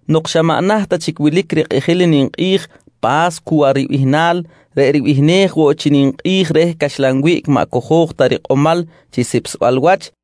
Nok xa maꞌ naht ta chic wilic rikꞌijil i ninkꞌi̱j Pa̱scuwa ribihnal reꞌ ribihnej woꞌ chi ninkꞌi̱j reh Caxlan Wiꞌc maꞌ cojo̱j ta rikꞌomal chi sipsbal wach,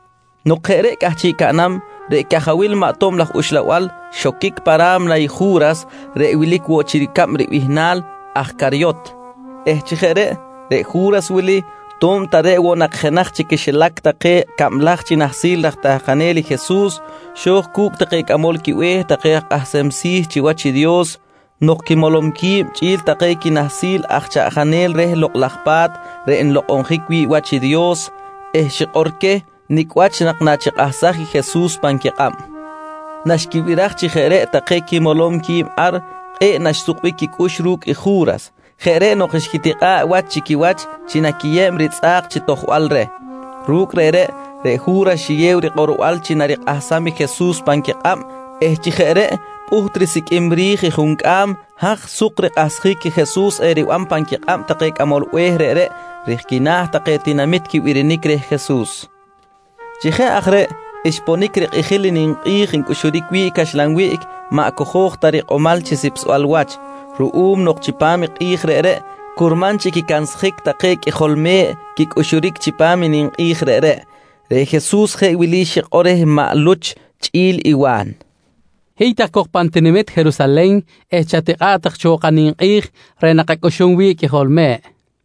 Nok jeꞌ reꞌ cꞌahchiꞌ caꞌnam, reꞌ cajawil maꞌ tob laj uxlabal xoquic pa ra̱mna i Ju̱ras reꞌ wilic woꞌ chi ricab bihnal aj Caryot eh chi jeꞌ reꞌ, reꞌ Ju̱ras wili to̱b ta reꞌ woꞌ nak jenaj chi quixilac take cablaj chi nahsil raj tahkanel i Jesus, xo̱j cu̱cꞌ take cꞌamol quibe̱h take aj kꞌahsem si̱ chiwach i Dios nok quimolom qui̱b chꞌi̱l take quinahsil aj chaꞌjanel reh Lokꞌ laj Pa̱t reꞌ nlokꞌonjic wi̱ꞌ wach i Dios eh xikꞌor queh nicꞌ wach nak nachikꞌahsaj i Jesus pan quikꞌab. Naxquibiraj chi jeꞌ reꞌ take quimolom qui̱b ar, kꞌe̱ꞌ naxsukbic quicꞌux ru̱cꞌ i Ju̱ras. Jeꞌ reꞌ nok xquitikꞌa̱ꞌ wach chi quiwach chi naquiyeb ritzꞌa̱k chi tojbal reh. Ru̱cꞌ reꞌreꞌ, reꞌ Ju̱ras xiyew rikꞌorbal chi narikꞌahsam i Jesus pan quikꞌab eh chi jeꞌ reꞌ pꞌuht risiqꞌuim ri̱j i juncꞌam haj suk rikꞌahsjic i Jesus eriban pan quikꞌab take cꞌamol be̱h reꞌreꞌ rij quina̱ take tinamit quibirinic reh Jesus. Chi jeꞌ aj reꞌ, xponic rikꞌijil i ninkꞌi̱j ncꞌuxuric wi̱ꞌ caxlan wiꞌc maꞌ cojo̱j ta rikꞌomal chi sipsbal wach. Ruꞌum nok chipam i kꞌi̱j reꞌreꞌ curman chi quicansjic take qꞌuijol me̱ꞌ quicꞌuxuric chipam i ninkꞌi̱j reꞌreꞌ, reꞌ Jesus jeꞌ wili xikꞌor reh maꞌ Luch chꞌi̱l i Wa̱n: «Hiy tak cok pan tinamit Jerusalen eh chatikꞌa̱ꞌ tak cho kaninkꞌi̱j reꞌ nakacꞌuxum wi̱ꞌ i qꞌuijol me̱ꞌ, nqui queh.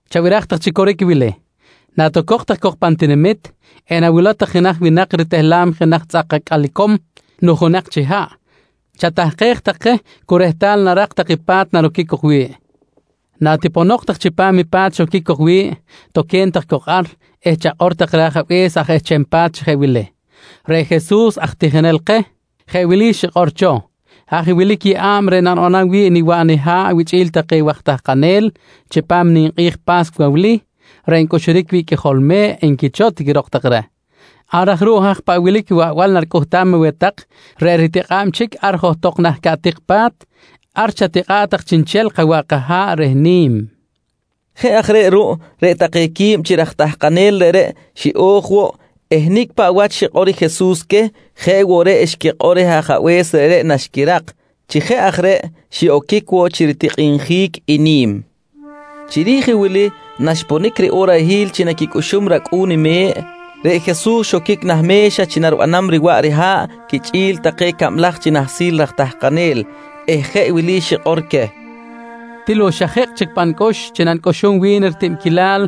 —Chabiraj tak chi coric i wili: Natocok tak cok pa̱m tinamit, enawilow tak i jenaj winak ritehlam jenaj tzꞌak acꞌal icom nujunak chi haꞌ, chatahkej tak je cu rehtal narak tak i pa̱t naroquic cok wi̱ꞌ. Natiponok tak chipam i pa̱t xoquic cok wi̱ꞌ, toque̱n tak cok ar eh chakꞌor tak reh ajabe̱s aj ehcham pa̱t chi jeꞌ wili: ‹Reꞌ Jesus reꞌ aj tijinel keh jeꞌ wili xikꞌor cho: ‹Haj wilic i yeꞌa̱b reꞌ nanibanam wi̱ꞌ niwaꞌ niha̱ꞌ wichꞌi̱l take waj tahkanel chipam i ninkꞌi̱j Pa̱scuwa wili reꞌ ncꞌuxuric wi̱ꞌ i qꞌuijol me̱ꞌ, nqui cho, tiquirok tak reh. «Ar aj ruꞌ haj paꞌ wilic i waꞌbal naricꞌuhtam aweh tak reꞌ ritikꞌa̱b chic ar johtok nah caꞌtik pa̱t, ar chatikꞌa̱ꞌ tak chiꞌnchel kawaꞌ kaha̱ꞌ reh ni̱m, nqui Jesus queh. Jeꞌ aj reꞌ ruꞌ, reꞌ take quib chi raj tahkanel reꞌreꞌ xiꞌo̱j woꞌ eh nicꞌ paꞌ wach xikꞌor i Jesus queh, jeꞌ woꞌ reꞌ xquikꞌor reh ajabe̱s reꞌreꞌ naxquirak. Chi jeꞌ aj reꞌ xiꞌoquic woꞌ chi ritikꞌinjic i ni̱m. Chiri̱j i wili naxponic riꞌorahil chi naquicꞌuxum i racꞌu̱n me̱ꞌ, reꞌ Jesus xoquic nah me̱xa chi naribanam riwaꞌ riha̱ꞌ quichꞌi̱l take cablaj chi nahsil raj tahkanel eh jeꞌ wili xikꞌor queh: «Til woꞌ xa ji̱kꞌ chic pa nicꞌux chi nanicꞌuxum wi̱n i ritibquilal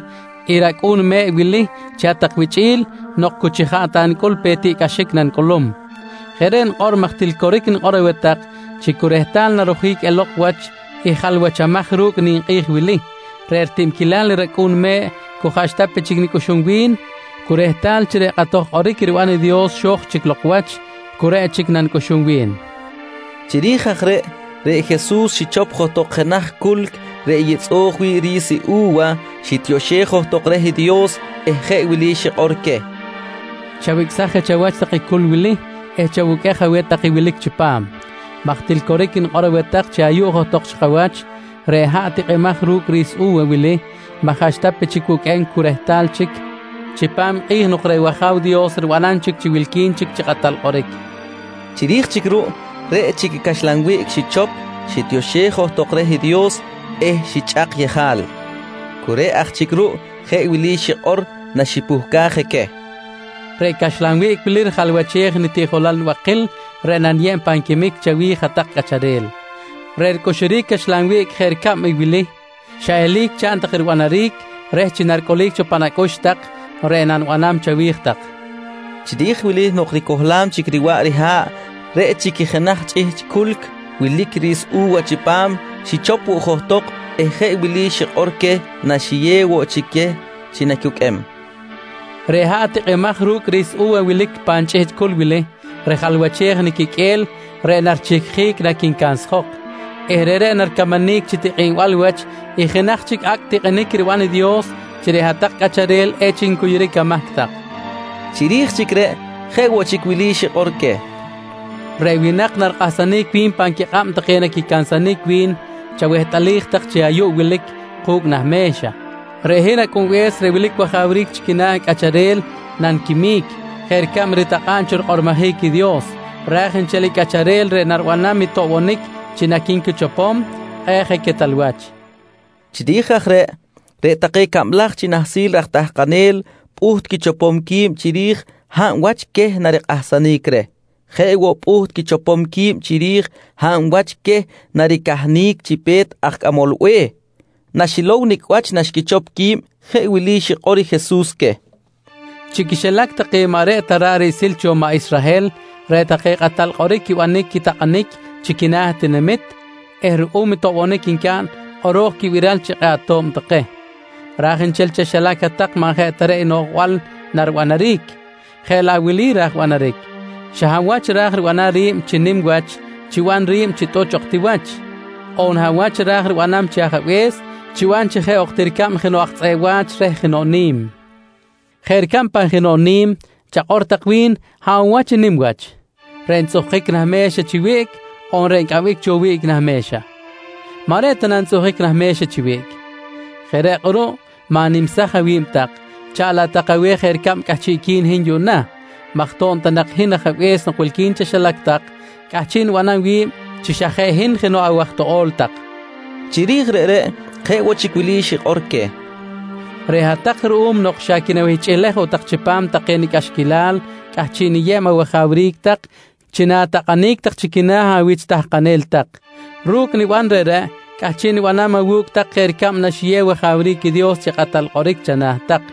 i racꞌu̱n me̱ꞌ wili chi hat-tak wichꞌi̱l nok chi cu jaꞌ nicꞌul ta pe i tiꞌcꞌaxic nanicꞌulum. Jeꞌ reꞌ nikꞌor maj til coric nikꞌor aweh tak chi cu rehtal narojic elok wach i jalwachamaj ru̱cꞌ ninkꞌi̱j wili, reꞌ ritibquilal i racꞌu̱n me̱ꞌ cu jaꞌxta pe chic nicꞌux wi̱n. Cu rehtal chi reꞌ kꞌatoj kꞌoric riban i Dios xo̱j chic lok wach, cu reꞌ chic nanicꞌuxum wi̱n, nqui queh. Chiri̱j aj reꞌ, reꞌ Jesus xichop johtok jenaj culc reꞌ yitzꞌo̱j wi̱ꞌ ri̱s u̱wa, xitioxej johtok reh i Dios eh jeꞌ wili xikꞌor queh: «Chawicꞌsaj je chawach tak i culc wili eh chawuqꞌuej aweh tak i wilic chipam maj til coric nikꞌor aweh tak chi ayuꞌ johtok chi kawach, reꞌ haꞌ tikꞌimaj ru̱cꞌ ri̱s u̱wa wili maꞌ jaꞌxta pe chic wuqꞌuem cu rehtal chic chipam i kꞌi̱j nok reꞌ wAja̱w Dios ribanam chic chi wilqui̱n chi kꞌatal kꞌoric, nqui queh. Chiri̱j chic ruꞌ, reꞌ chic i caxlan wiꞌc xichop xitioxej johtok i Dios eh xichꞌak yejal. Cu reꞌ aj chic ruꞌ jeꞌ wili xikꞌor naxipuhcaj je queh: «Reꞌ caxlan wiꞌc wili rijalwachej nitiꞌjolal nibakil reꞌ naniyeb pan quimic chawi̱j hat-tak cꞌacharel. Reꞌ ricꞌuxuric i caxlan wiꞌc jeꞌ ricab i wili, xa eli̱c chaꞌn tak ribanaric reh chi naricꞌulic cho pan acꞌux tak reꞌ nanibanam chawi̱j tak, nqui queh. Chiri̱j wili nok ricohlam chic riwaꞌ riha̱ꞌ, reꞌ chic i jenaj chꞌihchꞌ culc wilic i ri̱s i u̱wa chipam xichop woꞌ johtok eh jeꞌ wili xikꞌor queh naxiyew woꞌ chic queh chi nacuqꞌuem: «Reꞌ haꞌ tikꞌimaj ru̱cꞌ ri̱s u̱wa wilic pan chꞌihchꞌ culc wili, rijalwachej i niquiqꞌue̱l reꞌ narichihquic naquincansjok eh reꞌreꞌ naricamanic chi tikꞌinbal wach i jenaj chic acꞌ tikꞌinic riban i Dios chi reꞌ hat-tak cꞌacharel echic ncuyuric amahc tak, nqui queh. Chiri̱j chic reꞌ jeꞌ woꞌ chic wili xikꞌor queh: «Reꞌ winak narikꞌahsanic wi̱n pan quikꞌab take naquicansanic wi̱n chawehtꞌalij tak chi ayuꞌ wilic ku̱cꞌ nah me̱xa. Reꞌ hin Acꞌunbe̱s reꞌ wilic wajawric chi quina̱ cꞌacharel naniquimic jeꞌ ricab ritakꞌa̱b cho rikꞌormojic i Dios, raj nchel i cꞌacharel reꞌ naribanam i toꞌbonic chi naqui̱nquichopom, kꞌe̱ꞌ je quetal wach, nqui Jesus. Chiri̱j aj reꞌ, reꞌ take cablaj chi nahsil raj tahkanel pꞌuht quichopom qui̱b chiri̱j hab wach queh narikꞌahsanic reh. Jeꞌ woꞌ pꞌuht quichopom qui̱b chiri̱j hab wach queh naricahnic chi pe̱t aj cꞌamol be̱h. Naxilow nicꞌ wach naxquichop qui̱b jeꞌ wili xikꞌor i Jesus queh: «Chi quixilac take maꞌ reꞌ ta ra̱ꞌ riꞌsil cho maꞌ Israhel, reꞌ take kꞌatal kꞌoric quibanic i takꞌanic chi quina̱ tinamit eh ruꞌum i toꞌbonic ncaꞌn, kꞌoro̱j quibiral chi kꞌe̱ꞌ ato̱b take. Ra̱j nchel chaxilac hat-tak maꞌ jeꞌ ta reꞌ i noꞌjbal naribanaric, jeꞌ laꞌ wili ra̱j banaric: Xa hab wach ra̱j ribanam ri̱b chi nim wach chiban ri̱b chi tꞌuch ok ti wach. On hab wach ra̱j ribanam chi ajabe̱s, chiban chi jeꞌ ok ti ricab jenoꞌ aj tzꞌeꞌ wa̱ch reh jenoꞌ ni̱m. Jeꞌ ricab pan jenoꞌ ni̱m, chakꞌor tak wi̱n, hab woꞌ wach i nim wach? Reꞌ ntzꞌuhkic nah me̱xa chi wiꞌc on reꞌ ncꞌambic cho reh wiꞌc nah me̱xa? Maꞌ reꞌ ta na ntzꞌuhkic nah me̱xa chi wiꞌc? Jeꞌ reꞌ kꞌuruꞌ ma̱nimsaj awi̱b tak, chaꞌn laꞌ tak aweh jeꞌ ricab cꞌahchiꞌqui̱n i hin yuꞌna maj to̱b ta nak hin Ajabe̱s nok wilqui̱n chaxilac tak, cꞌahchiꞌ nibanam wi̱b chi xa jeꞌ hin jenoꞌ awaj toꞌo̱l tak, nqui queh. Chiri̱j reꞌreꞌ jeꞌ woꞌ chic wili xikꞌor queh: «Reꞌ hat-tak ruꞌum nok xa quinawihchꞌilej woꞌ tak chipam take nicꞌaxquilal cꞌahchiꞌ niyeb awajawric tak chi na̱takꞌanic tak chi quina̱ awich tahkanel tak. Ru̱cꞌ niban reꞌreꞌ cꞌahchiꞌ nibanam awu̱cꞌ tak jeꞌ ricab naxiyew wajawric i Dios chi kꞌatal kꞌoric chana̱ tak.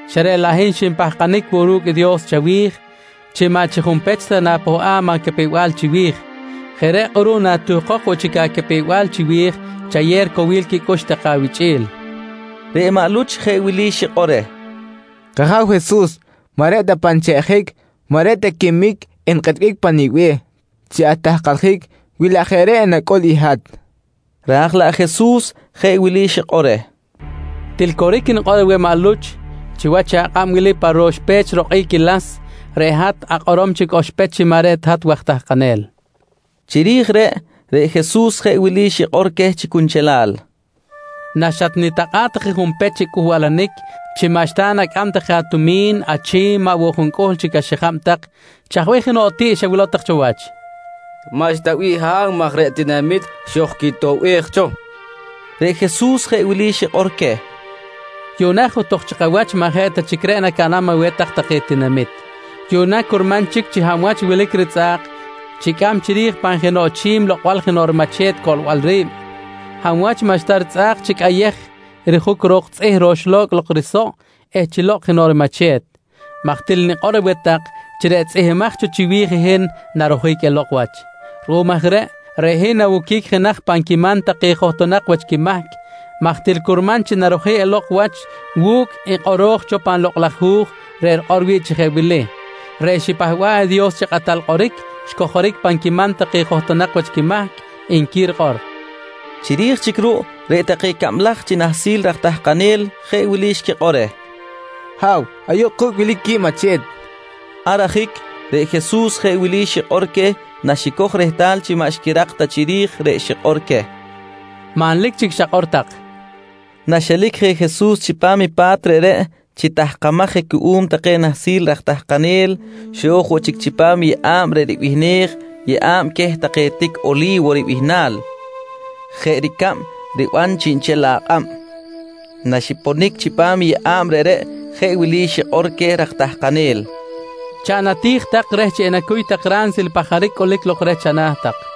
xa reꞌ laꞌ hin xinpahkanic woꞌ ru̱cꞌ i Dios chawi̱j chi maꞌ chi junpech na̱pohꞌam acapew-bal chiwi̱j. Jeꞌ reꞌ kꞌuruꞌ natuhkok woꞌ chic acapew-bal chiwi̱j chayew ricowil quicꞌux take awichꞌi̱l, nqui reh. Reꞌ maꞌ Luch jeꞌ wili xikꞌor reh: «K-Aja̱w Jesus, maꞌ reꞌ ta pan cheꞌjic maꞌ reꞌ ta quimic enkꞌetbic pa nibe̱h chi atahkaljic wi laꞌ jeꞌ reꞌ enacꞌul i hat, nqui reh. Raj laꞌ Jesus jeꞌ wili xikꞌor reh: «Til coric nikꞌor aweh maꞌ Luch, chiwach akꞌab wili pa ro̱x pech rokꞌic i las reꞌ hat akꞌorom chic oxpech chi maꞌ reꞌ ta hat waj tahkanel, nqui reh. Chiri̱j reꞌ, reꞌ Jesus jeꞌ wili xikꞌor queh chi cunchelal: «Naxatnitakꞌa̱ꞌ tak je junpech chi cꞌuhbalanic chi maꞌxta nacꞌam tak je atumi̱n, achi̱m, maꞌ woꞌ juncꞌuhl chic axijab tak, chaj bih jenoꞌ tiꞌ xawilow tak cho wach? nqui queh. —Maꞌxta bih Ha̱w, maj reꞌ tinamit xojquitoꞌbej cho, nqui take reh. Reꞌ Jesus jeꞌ wili xikꞌor queh: «Yuꞌna johtok chi kawach maꞌ jeꞌ ta chic reꞌ nacaꞌnam aweh tak take tinamit. Yuꞌna, curman chic chi hab wach wilic ritzꞌa̱k chicꞌam chiri̱j pan jenoꞌ chi̱m lokꞌbal jenoꞌ rimache̱t coꞌlbal ri̱b. Hab wach maꞌxta ritzꞌa̱k chi cꞌayej i rijuc ro̱k tzꞌih roxlo̱cꞌ lok risoꞌ eh chi lokꞌ jenoꞌ rimache̱t maj til nikꞌor aweh tak chi reꞌ tzꞌihmbimaj cho chiwi̱j i hin narojic elok wach. Ruꞌum aj reꞌ, reꞌ hin nawoquic jenaj pan quiman take johtonak wach quimahc maj til curman chi narojic elok wach wu̱cꞌ i kꞌoro̱j cho pan Lokꞌ laj Hu̱j reꞌ rikꞌor wi̱ꞌ chi jeꞌ wili: “Reꞌ xipahba̱ꞌ i Dios chi kꞌatal kꞌoric xcojoric pan quiman take johtonak wach quimahc, nqui rikꞌor, nqui queh. Chiri̱j chic ruꞌ reꞌ take cablaj chi nahsil raj tahkanel jeꞌ wili xquikꞌor reh: «Ha̱w, ayuꞌ ku̱cꞌ wilic quib mache̱t, nqui take reh. Ar ajic reꞌ Jesus jeꞌ wili xikꞌor queh naxicoj rehtal chi maꞌ xquirak ta chiri̱j reꞌ xikꞌor queh: «Manlic chic xakꞌor tak, nqui queh. Naxelic je Jesus chipam i pa̱t reꞌreꞌ chi tahkamaj je cuꞌum take nahsil raj tahkanel, xo̱j woꞌ chic chipam yeꞌa̱b reꞌ ribihnej “Yeꞌa̱b queh take tic Oli̱wo ribihnal”, jeꞌ ricab riban chiꞌnchel akꞌab. Naxiponic chipam yeꞌa̱b reꞌreꞌ, jeꞌ wili xikꞌor queh raj tahkanel: «Chaꞌn ati̱j tak reh chi enacuy tak ransil i pajaric cꞌulic lok reh chana̱ tak, nqui queh.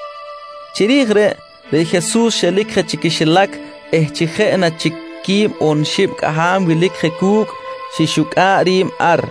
Chiri̱j reꞌ, reꞌ Jesus xelic je chi quixilac eh chi jeꞌ na chic quib on xib cꞌaham wilic je cu̱cꞌ, xixucꞌa̱ꞌ ri̱b ar.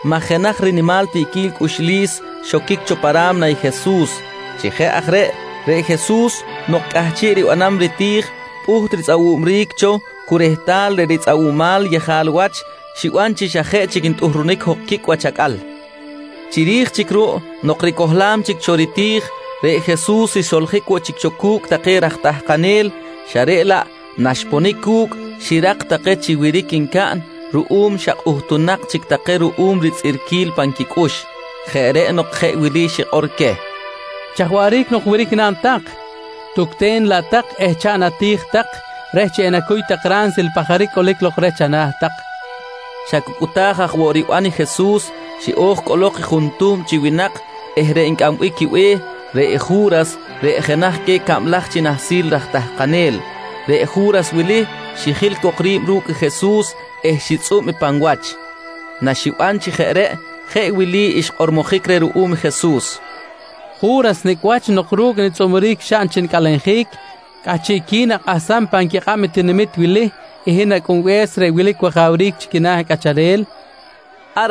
maj jenaj rinimal tiꞌquil cꞌuxlis xoquic cho pa ra̱mna i Jesus. Chi jeꞌ aj reꞌ, reꞌ Jesus nok cꞌahchiꞌ ribanam riti̱j pꞌuht ritzꞌawubric cho cu rehtal reꞌ ritzꞌawumal yejal wach xiban chi xa jeꞌ chic ntꞌuhrunic jok quicꞌ wach acꞌal. Chiri̱j chic ruꞌ nok ricohlam chic cho riti̱j, reꞌ Jesus xsoljic woꞌ chic cu̱cꞌ take raj tahkanel xa reꞌ laꞌ naxponic cu̱cꞌ, xirak take chi wiric ncaꞌn ruꞌum xa kꞌuhtunak chic take ruꞌum tzꞌirquil pan quicꞌux. Jeꞌ reꞌ nok jeꞌ wili xikꞌor queh: «Chaj waꞌric nok wiric naꞌn tak? Tucten laꞌ tak eh chaꞌn ati̱j tak reh chi enacuy tak ransil i pajaric cꞌulic lok reh chana̱ tak, nqui queh. Xa cu cꞌuta̱j aj woꞌ riban i Jesus, xiꞌo̱j cꞌolok i juntuhm chi winak eh reꞌ ncꞌambic quibe̱h, reꞌ i Ju̱ras reꞌ jenaj queh cablaj chi nahsil raj tahkanel. Reꞌ Ju̱ras wili xijil cok ri̱b ru̱cꞌ Jesus eh xitzꞌub pan wach. Naxiban chi jeꞌ reꞌ jeꞌ wili xkꞌormojic reh ruꞌum Jesus: «Ju̱ras, nicꞌ wach nok chi ru̱cꞌ nitzꞌuburic xaꞌn chi nicꞌalenjic cꞌahchiꞌqui̱n akꞌahsam pan quikꞌab i tinamit wili i hin Acꞌunbe̱s reꞌ wilic wajawric chi quina̱ cꞌacharel? nqui reh.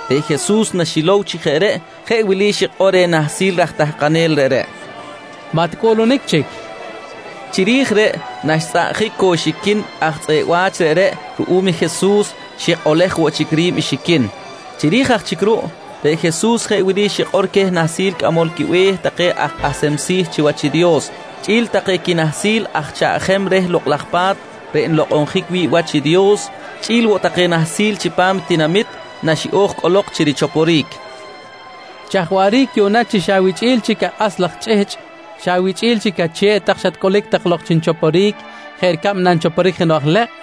Reꞌ Jesus naxilow chi jeꞌ reꞌ, jeꞌ wili xikꞌor reh nahsil raj tahkanel reꞌreꞌ: «Maꞌ ticꞌuꞌlunic chic, nqui reh. Chiri̱j reꞌ naxtzꞌaꞌjic cok rixiquin i aj tzꞌeꞌ wa̱ch reꞌreꞌ ruꞌum i Jesus, xikꞌolej woꞌ chic ri̱b i xiquin. Chiri̱j aj chic ruꞌ reꞌ Jesus jeꞌ wili xikꞌor queh nahsil cꞌamol quibe̱h take aj kꞌahsem si̱ chiwach i Dios chꞌi̱l take quinahsil aj chaꞌjem reh Lokꞌ laj Pa̱t reꞌ nlokꞌonjic wi̱ꞌ wach i Dios, chꞌi̱l woꞌ take nahsil chipam tinamit naxiꞌo̱j cꞌolok chi richoporic: «Chaj waꞌric yuꞌna chi xa awichꞌi̱l chic akꞌas laj chꞌihchꞌ, xa awichꞌi̱l chic ache̱ꞌ tak xatcꞌulic tak lok chi nichoporic jeꞌ ricab nanchoporic jenoꞌ aj lekꞌ?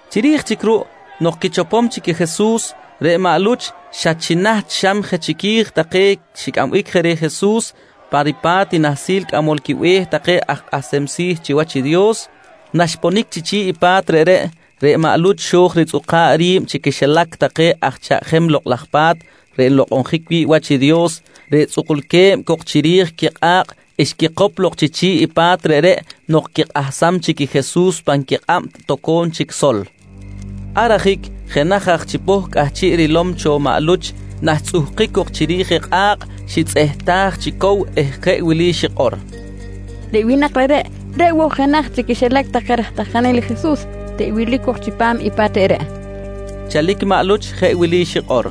Chiri̱j chic ruꞌ nok quichopom i Jesus, reꞌ maꞌ Luch xa chi naht xam je chiqui̱j take xicꞌambic je reh Jesus pa ripa̱t i nahsil cꞌamol quibe̱h aj take kꞌahsem si̱ chiwach i Dios. Naxponic chi chi̱ꞌ i pa̱t reꞌreꞌ, reꞌ maꞌ Luch xo̱j ritzꞌuka̱ꞌ ri̱b chi quixilac take aj chaꞌjem Lokꞌ laj Pa̱t reꞌ nlokꞌonjic wi̱ꞌ wach i Dios, reꞌ tzꞌukulque̱b cok chiri̱j quikꞌa̱kꞌ xquikop lok chi chi̱ꞌ i pa̱t reꞌreꞌ nok quikꞌahsam chic i Jesus pan quikꞌab toco̱m chic sol. Ar ajic jenaj aj chipoh cꞌahchiꞌ rilom cho maꞌ Luch naxtzꞌuhkic cok chiri̱j kꞌa̱kꞌ xitzꞌehtaj chi cow eh jeꞌ wili xikꞌor: «Reꞌ winak reꞌreꞌ, reꞌ woꞌ jenaj chi quixilac take raj tahkanel i Jesus reꞌ wilic cok chipam i pa̱t reꞌreꞌ! nqui xikꞌor. Chalic maꞌ Luch jeꞌ wili xikꞌor: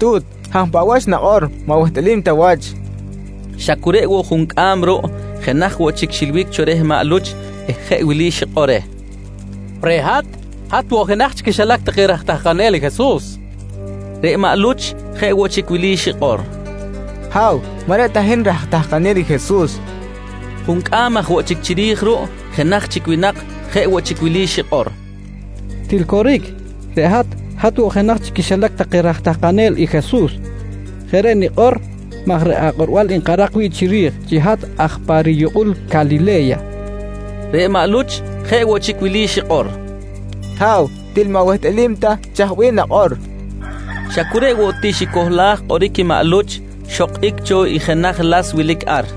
«Tu̱t, hab paꞌ wach nakꞌor maꞌ wehtꞌalim ta wach, nqui. Xa cu reꞌ woꞌ juncꞌam ruꞌ, jenaj woꞌ chic xilbic cho reh maꞌ Luch eh jeꞌ wili xikꞌor reh: «Reꞌ hat, hat woꞌ jenaj chi quixilac take raj tahkanel i Jesus, nqui reh. Reꞌ maꞌ Luch jeꞌ woꞌ chic wili xikꞌor: «Ha̱w, maꞌ reꞌ ta hin raj tahkanel i Jesus, nqui reh. Juncꞌam aj woꞌ chic chiri̱j ruꞌ, jenaj chic winak jeꞌ woꞌ chic wili xikꞌor: «Til coric, reꞌ hat, hat woꞌ jenaj chi quixilac take raj tahkanel i Jesus. Jeꞌ reꞌ nikꞌor maj reꞌ akꞌorbal nkarak wi̱ꞌ chiri̱j chi hat aj pa riyukꞌul Calile̱ya, nqui xikꞌor. Reꞌ maꞌ Luch jeꞌ woꞌ chic wili xikꞌor: «Ha̱w, til maꞌ wehtꞌalim ta chaj bih nakꞌor, nqui reh. Xa cu reꞌ woꞌ ti xicohlaj kꞌoric i maꞌ Luch, xokꞌic cho i jenaj las wilic ar.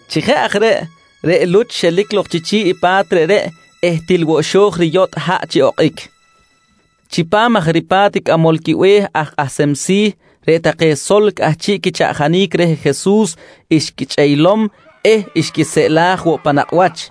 Chi jeꞌ aj reꞌ, reꞌ Luch xelic lok chi chi̱ꞌ i pa̱t reꞌreꞌ eh til woꞌ xo̱j riyotꞌ haꞌ chi okꞌic. Chipam aj ripa̱t cꞌamol quibe̱h aj kꞌahsem si̱, reꞌ take sol cꞌahchiꞌ quichaꞌjanic reh Jesus xquichꞌeylom eh xquiseꞌlaj woꞌ pan nakꞌ wach.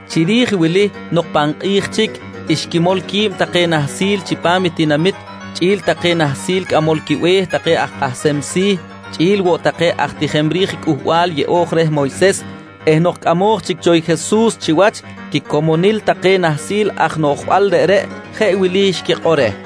Chiri̱j wili nok pan kꞌi̱j chic, xquimol quib take nahsil chipam tinamit chꞌi̱l take nahsil cꞌamol quibe̱h take aj kꞌahsem si̱ chꞌi̱l woꞌ take aj tijem ri̱j Cꞌuhbal Yeꞌo̱j reh Moyses eh nok cꞌamoj chic cho i Jesus chiwach quicomonil take nahsil aj noꞌjbal reꞌreꞌ, jeꞌ wili xquikꞌor reh: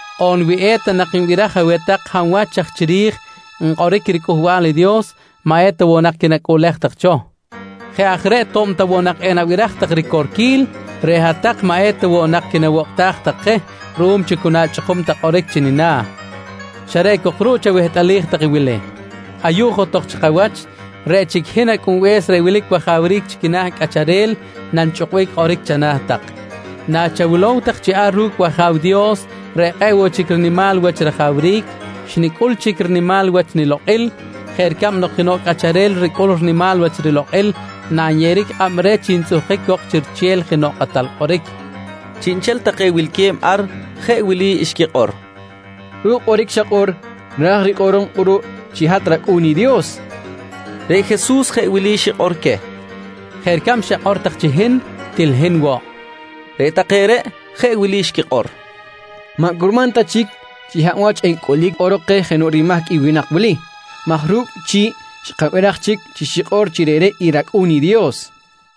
On wi eta nak nibiraj aweh tak hab wach aj chiri̱j nkꞌoric riCꞌuhbal i Dios, maꞌ eta woꞌ nak quinacꞌuꞌlej tak cho. Jeꞌ aj reꞌ to̱b ta woꞌ nak enabiraj tak ricorquil, reꞌ hat-tak maꞌ eta woꞌ nak quinawokꞌtaj tak je ruꞌum chi cu nachꞌukum tak kꞌoric chi nina̱. Xa reꞌ cok ruꞌ chawehtꞌalij tak i wili: Ayuꞌ johtok chi kawach, reꞌ chic i hin Acꞌunbe̱s reꞌ wilic wajawric chi quina̱ cꞌacharel nanichꞌukbic kꞌoric chana̱ tak, nachawilow tak chi ar ru̱cꞌ i wAja̱w Dios reꞌ kꞌe̱ꞌ woꞌ chic rinimal wach rajawric, xnicꞌul chic rinimal wach nilokꞌil jeꞌ ricab nok jenoꞌ cꞌacharel ricꞌul rinimal wach rilokꞌil nanyeꞌeric kꞌab reh chi ntzꞌuhkic cok chi riche̱l jenoꞌ kꞌatal kꞌoric, nqui queh. Chiꞌnchel take wilque̱b ar jeꞌ wili xquikꞌor: «Ru̱cꞌ kꞌoric xakꞌor raj rikꞌorom kꞌuruꞌ chi hat rAcꞌu̱n i Dios, nqui take. Reꞌ Jesus jeꞌ wili xikꞌor queh: «Jeꞌ ricab xakꞌor tak chi hin, til hin woꞌ, nqui queh. Reꞌ take reꞌ jeꞌ wili xquikꞌor: «Maꞌ curman ta chic chi hab wach encꞌulic kꞌorok keh jenoꞌ rimahc i winak wili maj ru̱cꞌ chi̱ꞌ xkabiraj chic chi xikꞌor chi reꞌreꞌ i rAcꞌu̱n i Dios, nqui take.